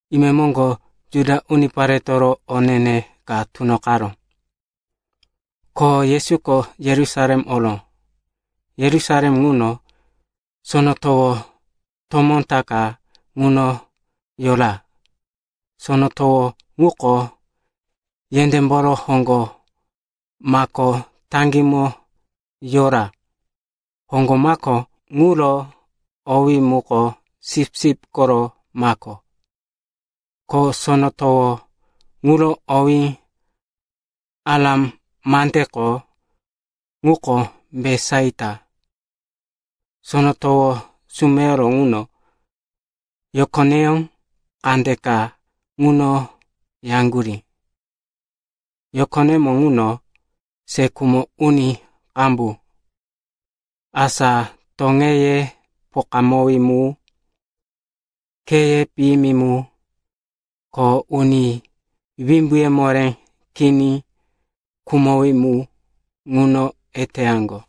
Imemoŋgo Juda uniparetoro o ne-ne ka tunoqaró, ko Yesuko Yerusalem oró. Yerusalem ŋuno, sono towo tomó ta ka ŋuno yora. Sono towo ŋuko yendémboro hoŋgo mako taŋgímo yora. Hoŋgo mako ŋuro owí muko Sipsip koro Mako, ko sono towo ŋuro owí Aram mandeko ŋuko Betisaita. Sono towo sumeyoro ŋuno yokoneyó kandeka ŋuno yaŋgurí. Yokonemo ŋuno se khumo uni qambu, asa toŋeye pokawí mu, kheye piyimi mu, ko uni wimbuye moré kini khumowí mu, ŋuno eteyaŋgo.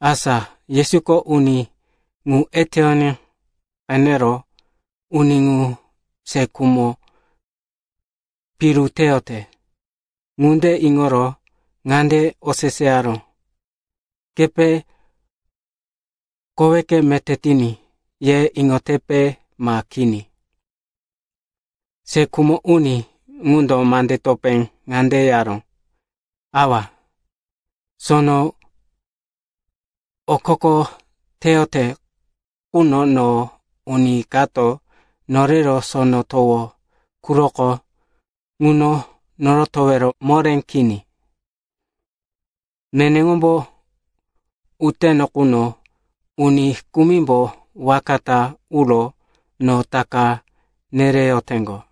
Asa Yesuko uni ŋu eteyoní qenero, uni ŋu se khumo piru teyote, ŋunde iŋoro ŋande oseseyaró, “Kepe, koweke meté tiní, ye iŋotepe, ma kini?” Se khumo uni ŋundo mande topé ŋande yaró, “Awa, sono okoko teyote quno no uni kato norero sono towo quroko ŋuno norotowero moré kini. Neneŋombo uyoteno quno uni kumimbo waka ta uro no taka nereyoteŋgo.”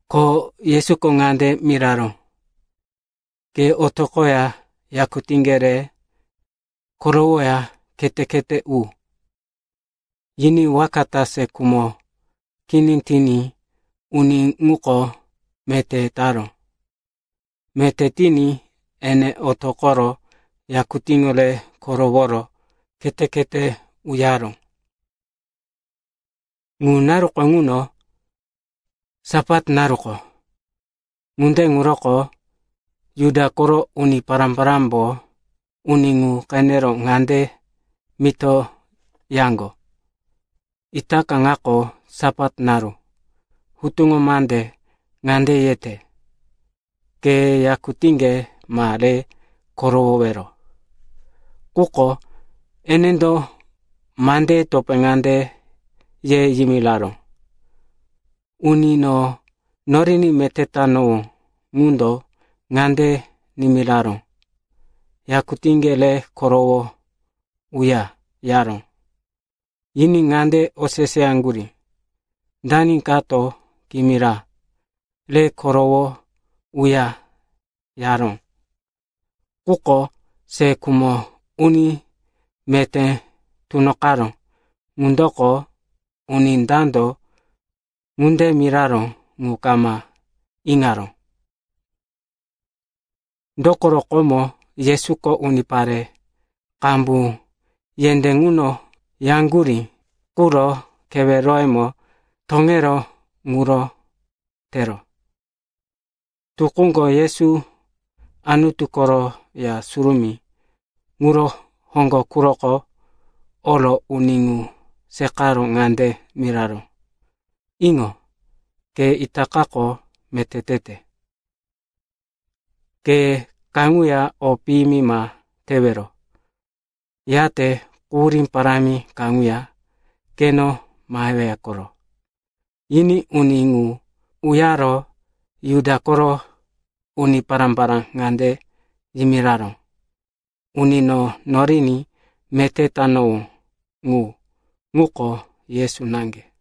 Ko Yesuko ŋande miraró, “Ke otoqoya yakutíŋge re korowoya khete-khete u.” Yiní waka ta se khumo kini tiní uni ŋuko meté taró. Meté tiní ene otoqoro yakutíŋo re koroworo khete-khete uyaró. Ŋu naru ŋuko Sapat naruko. Ŋunde ŋuroko Juda koro uni pará-parámbo uni ŋu qenero ŋande mito yaŋgo, “Itaka ŋako Sapat naru. Hutuŋo mande ŋande yete, ke yakutíŋge ma re korowowero.” Quko enendo mandeye topé ŋande ye yimiraró, “Uni no noriní meté tanowó ŋundo ŋande nimiraró, ‘Yakutíŋge re korowo uya,’ yaró.” Yiní ŋande oseseyaŋgurí, “Dani kato kimira, ‘Re korowo uya,’ yaró?” Quko se khumo uni meté tunoqaró ŋundoko uni dando ŋunde miraró ŋu kama iŋaró, dokoro komo Yesuko unipare qambu yendé ŋuno yaŋgurí quro keweroyemo toŋeró ŋuro tero. Tukúko Yesu Anutu koro Ya Surumí ŋuro hoŋgo quroko oro uni ŋu seqaro ŋande miraró, “Iŋo. Ke itakako meté tete. Ke kaŋuya o piyimi ma tewero, yate quhurí parámi kaŋuya keno maheweya koro.” Yiní uni ŋu uyaro Juda koro uni pará-pará ŋande yimiraró, “Uni no noriní meté tanowó ŋu, ŋuko Yesu naŋge.”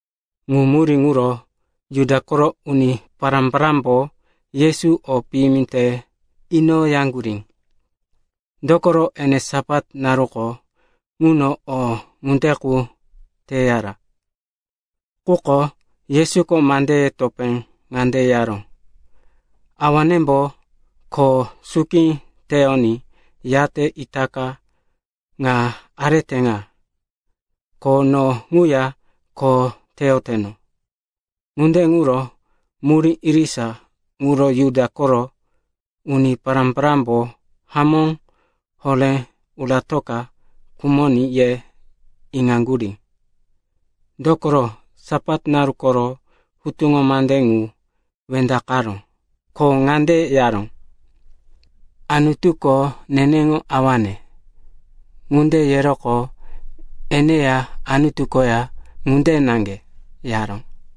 Ŋu murí ŋuro Juda koro uni pará-parámbo Yesu o piyimi te inoyaŋgurí, dokoro ene Sapat naruko ŋuno o ŋunde qu teyara. Quko Yesuko mandeye topé ŋande yaró, “Awanembo kho suki teyoní, yate itaka ŋa arete ŋa. Ko no ŋuya kho teyoteno.” Ŋunde ŋuro murí irisa ŋuro Juda koro uni pará-parámbo hamó horé, uratoka khumoní, ye iŋaŋgurí. Dokoro Sapat naru koro hutuŋo mande ŋu wendaqaró, ko ŋande yaró, “Anutuko neneŋo awane.” Ŋunde yeroqo eneya Anutu koya ŋunde naŋge, yaró.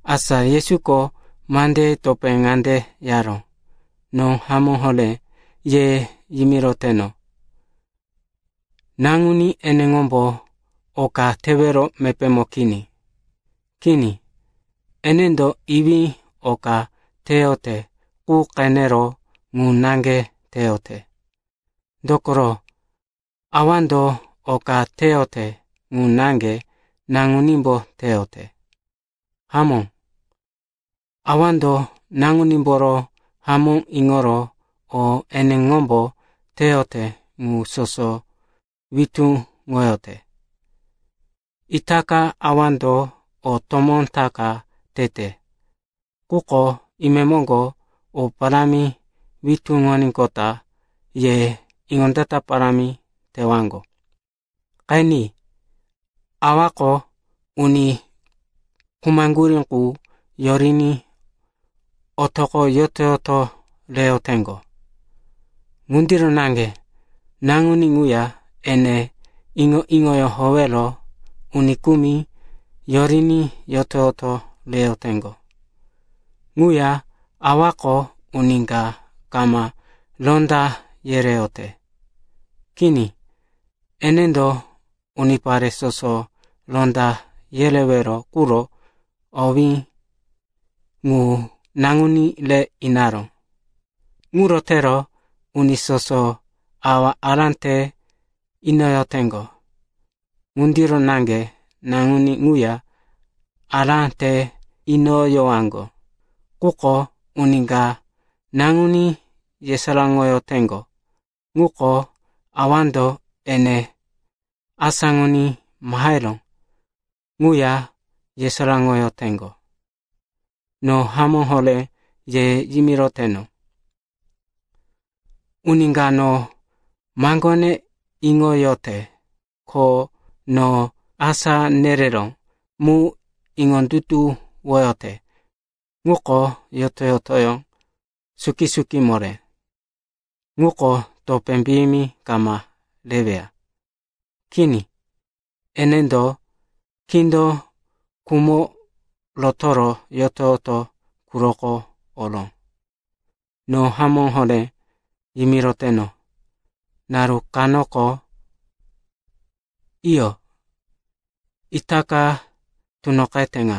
Asa Yesuko mandeye topé ŋande yaró, “No hamó horé ye yimiroteno, Naŋuní eneŋombo oka tewero mepémo kini. Kini, enendo Iwí oka teyote qu qenero ŋu naŋge teyote. Dokoro Awando oka teyote ŋu naŋge Naŋunímbo teyote. Hamó, Awando Naŋunímboro hamó iŋoro o eneŋombo teyote ŋu soso witúŋoyote. Itaka Awando o tomó ta ka tete, quko imemoŋgo o parámi witúŋoníqota ye iŋondata parámi tewaŋgo. Qeni, Awako uni khumaŋgurí ŋu yoriní otoqo yoto-yoto reyoteŋgo. Ŋundiro naŋge Naŋuní ŋuya ene iŋo-iŋoyó howero uni kumi yoriní yoto-yoto reyoteŋgo. Ŋuya Awako uni ka kama ronda yereyote. Kini, enendo unipare soso ronda yerewero quro owé ŋu Naŋuní re inaró. Ŋuro tero uni soso Awa ará te inoyoteŋgo ŋundiro naŋge Naŋuní ŋuya ará te inoyowaŋgo. Quko uni ka Naŋuní yesaráŋoyoteŋgo ŋundo Awando ene asáŋoní maheró ŋuya yesaráŋoyoteŋgo. “No hamó horé ye yimiroteno, uni ka no maŋgone iŋoyote ko no asá nereró mu iŋondutuwoyote ŋuko yoto-yotoyó suki-suki moré. Ŋuko topé piyimi kama reweya. Kini. Enendo kindo khumo rotoro yoto-yoto quroko oró. No hamó horé yimiroteno, naru kanoko, iyo, itaka tunoqete ŋa,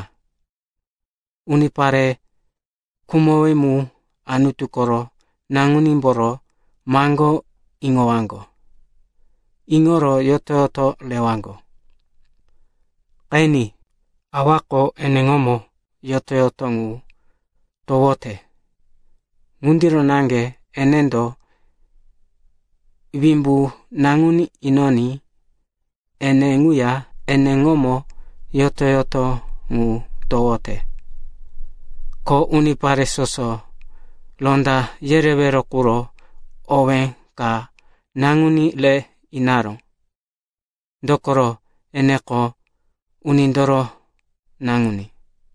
unipare khumowí mu Anutu koro Naŋunímboro maŋgó iŋowaŋgo. Iŋoro yoto-yoto rewaŋgo. Qeni, Awako eneŋomo yoto-yoto ŋu towote. Ŋundiro naŋge enendo wimbu Naŋuní inoní ene ŋuya eneŋomo yoto-yoto ŋu towote. Ko unipare soso ronda yerewero quro owé ka Naŋuní re inaró, dokoro eneko Unindoro Naŋuní.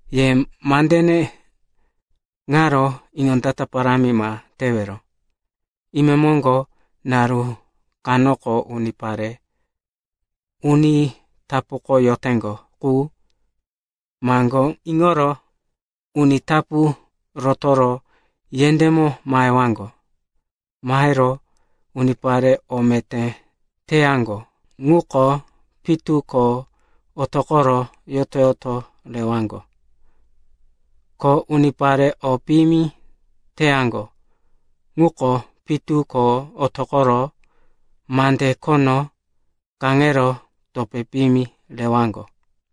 “Ye mandene ŋaro iŋondata parámi ma tewero. Imemoŋgo naru kanoko unipare uni tapuko yoteŋgo qu maŋgó iŋoro uni tapu rotoro yendémo mahewaŋgo. Mahero unipare o meté teyaŋgo ŋuko pitu ko otoqoro yoto-yoto rewaŋgo. Ko unipare o piyimi teyaŋgo ŋuko pitu ko otoqoro mande khono kaŋero topé piyimi rewaŋgo.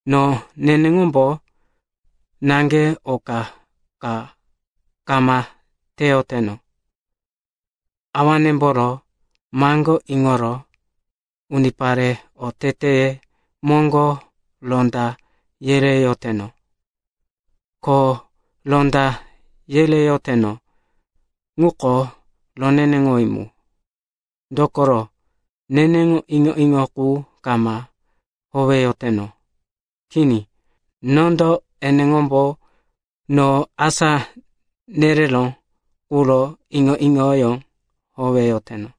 No neneŋombo naŋge oka ka kama teyoteno. Awanemboro maŋgó iŋoro unipare oteteye moŋgo ronda yereyoteno. Ko ronda yereyoteno ŋuko roneneŋowí mu, dokoro neneŋo iŋo-iŋo qu kama howeyoteno. Kini. Nondo eneŋombo no asá nereró ŋuro iŋo-iŋoyó howeyoteno.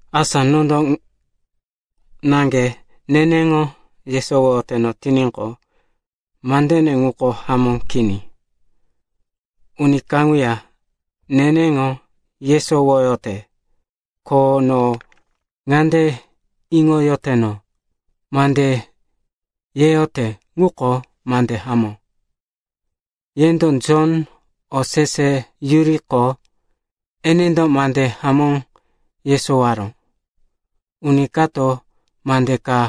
“Asa nondo naŋge neneŋo yesowoyoteno tiníqo, mande ŋuko hamó kini. Uni kaŋuya neneŋo yesowoyote, ko no ŋande iŋoyoteno, mande yeyote ŋuko mande hamó. “Yendo Jon oseseyuriqo, enendo mande hamó yesowaró. Uni kato mande ka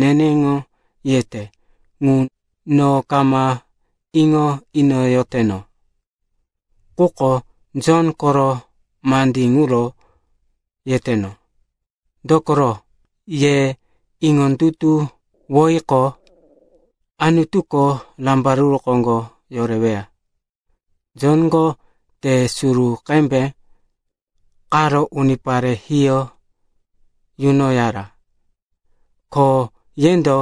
neneŋo yete ŋu no kama iŋo inoyoteno. Quko Jon koro mandí ŋuro yeteno, dokoro, ye iŋondutuwoyiqo, Anutuko rambaruru koŋgo yoreweya. Jonko te suru qembe qaro unipare hiyó yunoyara. Ko yendo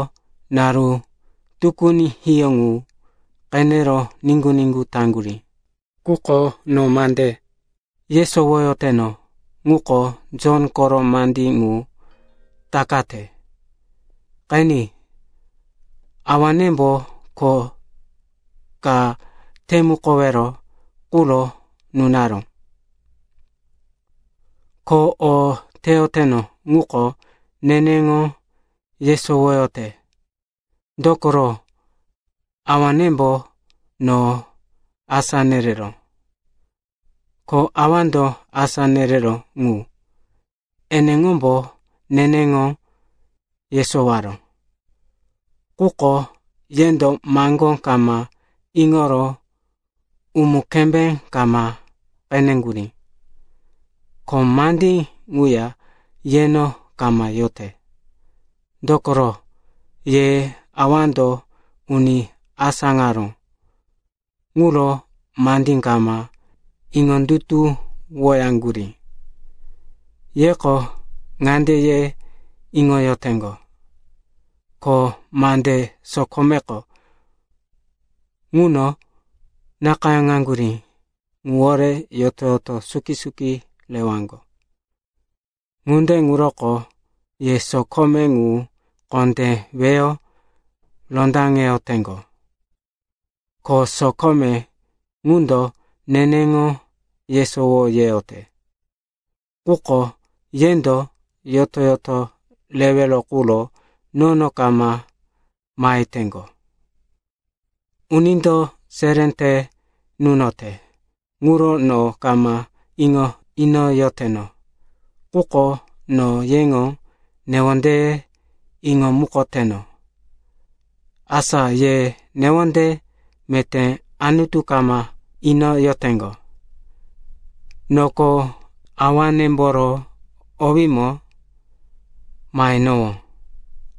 naru tukuni hiyó ŋu qenero niŋgu-niŋgu taŋgurí. “Quko no mande yesowoyoteno ŋuko Jon koro mandí ŋu takate. Qeni, Awanembo kho ka temukowero quro nunaró. Ko o teyoteno ŋuko neneŋo yesowoyote, dokoro Awanembo no asá nereró. Ko Awando asá nereró ŋu, eneŋombo neneŋo yesowaró, quko yendo maŋgó kama iŋoro umu-kembé kama qeneŋgurí. Ko mandí ŋuya yeno kama yote, dokoro, ye Awando uni asáŋaró ŋuro mandí kama iŋondutuwoyaŋgurí. Yeko ŋande ye iŋoyoteŋgo, ko mande sokomeko ŋuno nakayáŋaŋgurí ŋuwore yoto-yoto suki-suki rewaŋgo. Ŋunde ŋuroko ye sokome ŋu kondé weyo rondaŋeyoteŋgo. Ko sokome ŋundo neneŋo yesowo yeyote, quko yendo yoto-yoto rewero quro nono kama maheteŋgo. “Unindo seré te nunote ŋuro no kama iŋo inoyoteno. Quko no yeŋo newondeye iŋomukoteno, asa ye newonde meté Anutu kama inoyoteŋgo. Noko Awanemboro owímo mahenowó,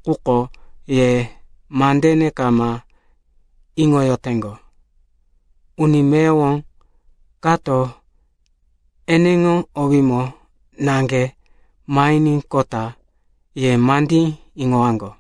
quko ye mandene kama iŋoyoteŋgo. Uni meyowo kato eneŋo owímo naŋge mahiníqota ye mandí iŋowaŋgo.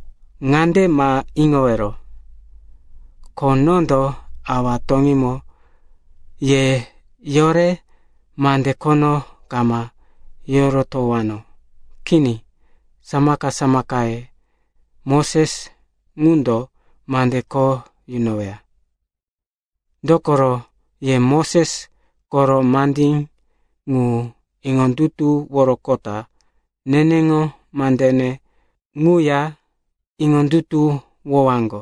“Ŋande ma iŋowero, ko nondo Awa toŋímo ye yore mande khono kama yorotowano. Kini, samaka-samakaye, Moses ŋundo mande kho yunoweya. Dokoro ye Moses koro mandí ŋu iŋondutuworoqota neneŋo mandene ŋuya iŋondutuwowaŋgo,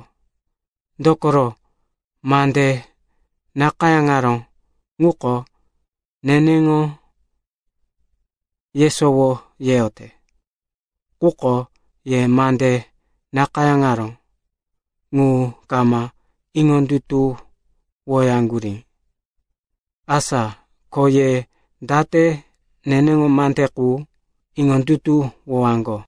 dokoro, mande nakayáŋaró ŋuko neneŋo yesowo yeyote. Quko ye mande nakayáŋaró ŋu kama iŋondutuwoyaŋgurí. Asa ko ye date neneŋo mande qu iŋondutuwowaŋgo?”